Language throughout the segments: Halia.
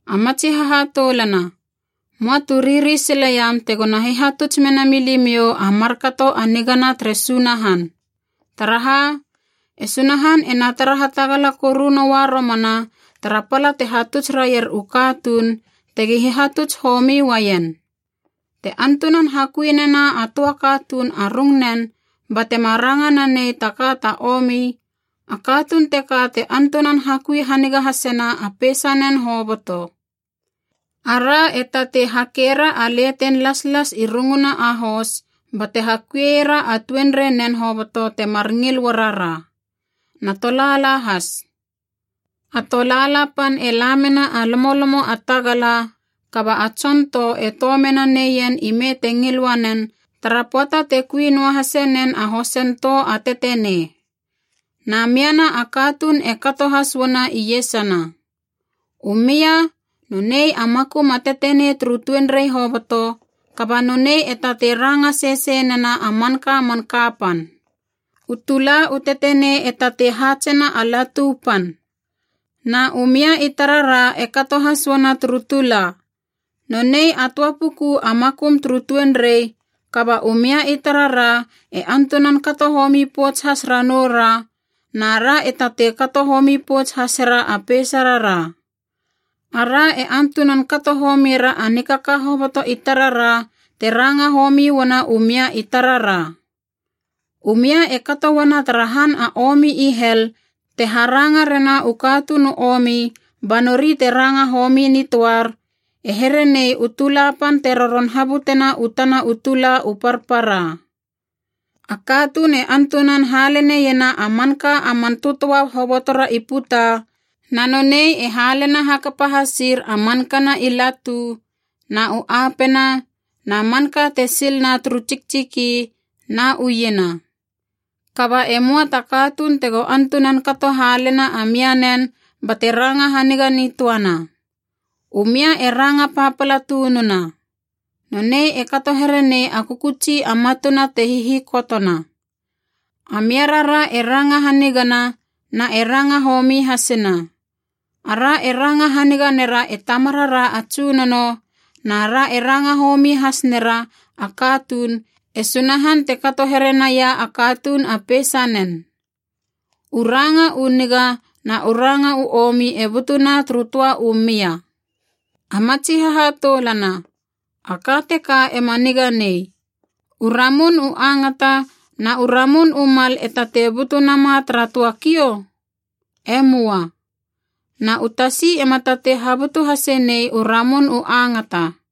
A matsi hahatoulana, möa tu riri sileiam tegona hihatuts menami limiou a markato a nigana tere Sunahan. Taraha, e Sunahan ena tara hatagala koru noa romana tara pala te hatuts raier u katuun, tegi hihatuts homi uaien. Te antunan hakui nena a töa katuun a rungnen batema ranga nanei ta ka ta omi, a katuun teka te antunan hakui haniga hasena a peisanen hoboto. Ara e tatei hakera a leten laslas i runguna a hos bate hakuiera a tuenreinen hoboto temar ngil uarara. Na tolaala has. A tolaala pan e la mena a lomolomo a tagala, kaba a tson tou e tou mena neien ime te ngil uanen tara pöata te kui noahase nen a hosen tou a tetenei. Na miana a katuun e kato has uana iesana. U mia, nonei a makum a tetenei turu tuenrei hoboto, kaba nonei e tatei ranga sesei nena a manka man kapan. U tula u tetenei e tatei haatsena a latu pan. Na u mia i tarara e kato has uana turu tula. Nonei a töa puku a makum turu tuenrei, kaba u mia i tarara e antunan kato homi pouts has ranoura, na ra e tatei kato homi pouts hasera a peisarara. Ara e antunan kato homiera a nikaka hoboto i tarara te ranga homi uana u mia i tarara. U mia e kato uana tara han a omi i hel te haranga rena u katuun u omi ba nori te ranga homi nitöar, e here nei u tula pan te roron habutena u tana u tula u parpara. A katuun e antunan haleneiena a manka a man tötöa hobotora i puta, na nonei e halena hakapa hasir a mankana i latu, na u apena, na manka te sil na turu tsiktsiki, na u iena. Kaba e möa ta katuun tego antunan kato halena a mianen bate ranga haniga nitöana. U mia e ranga papala tununa. Nonei e kato herenei a kökötsi a matuna te hihikotona. A mia rara e ranga hanigana na e ranga homi hasina. Ara e ranga haniga nera e Tamarara a Tsunono, na ra e ranga homi has nera a katuun, e Sunahan te kato here naia a katuun a peisanen. U ranga u niga na u ranga u omi e butuna turu töa u mia. A matsi hahatoulana, a ka teka ema niga nei. U ramun u angata na u ramun u mal e tatei butu nama tara töa kiou? E möa. Na u tasi ema tatei habutu hase nei u ramun u angata.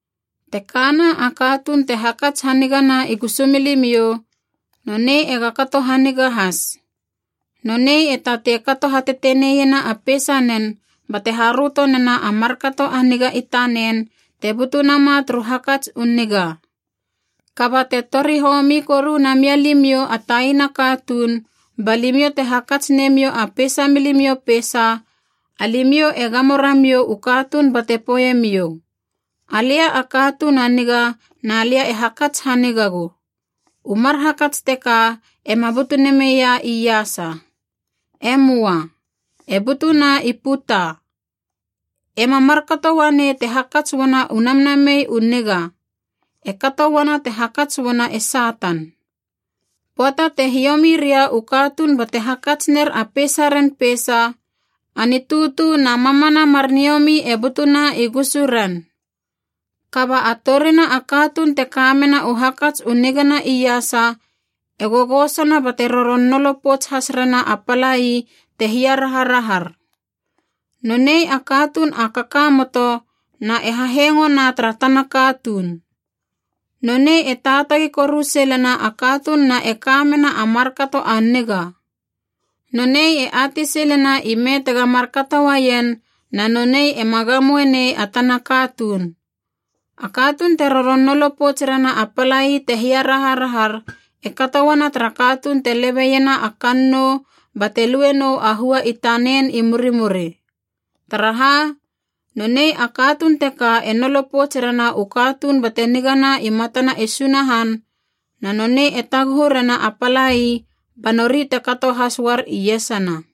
Te kana a katuun te hakats hanigana i gusumilimiou, nonei ega kato haniga has. Nonei e tatei kato hateteneiena a peisanen bate haröto nena a markato a niga i tanen te butu nama turu hakats u niga. Kaba te tori homi koru na mialimiou a taina katuun ba limiou te hakats nemiou a peisa milimiou peisa, alimiou e gamo ramiou u katuun bate poeiemiou, “Alia a katuun a niga na lia e hakats hanigagu.” U mar hakats teka ema butu nameia iasa. E möa. E butuna i puta. Ema markato uanei te hakats uana u namnamei u niga. E kato uana te hakats uana e Satan. Pöata te hiomi ria u katuun bate hakats ner a peisaren peisa, a nitutu na mamana mar niomi e butuna i gusuren. Kaba a torina a katuun te kamena u hakats u nigana iasa e gogosona bate roron nolo pouts has rena a palai te hiaraharahar. Nonei a katuun a kakamoto na e hahengona tara tana katuun. Nonei e taatagi koru silena a katuun na e ka mena a markato a niga. Nonei e atei silena ime tega markato uaien, na nonei ema gamoe nei a tana katuun. A katuun te roron nolo pouts rena a palai te hiaraharahar e kato uana tara katuun te lebeiena a kannou bate lue nou a hua i tanen i murimuri. Taraha, nonei a katuun teka e nolo pouts rena u katuun bate nigana i matana e Sunahan, na nonei e taguhu rena a palai ba nori te kato has uar iesana.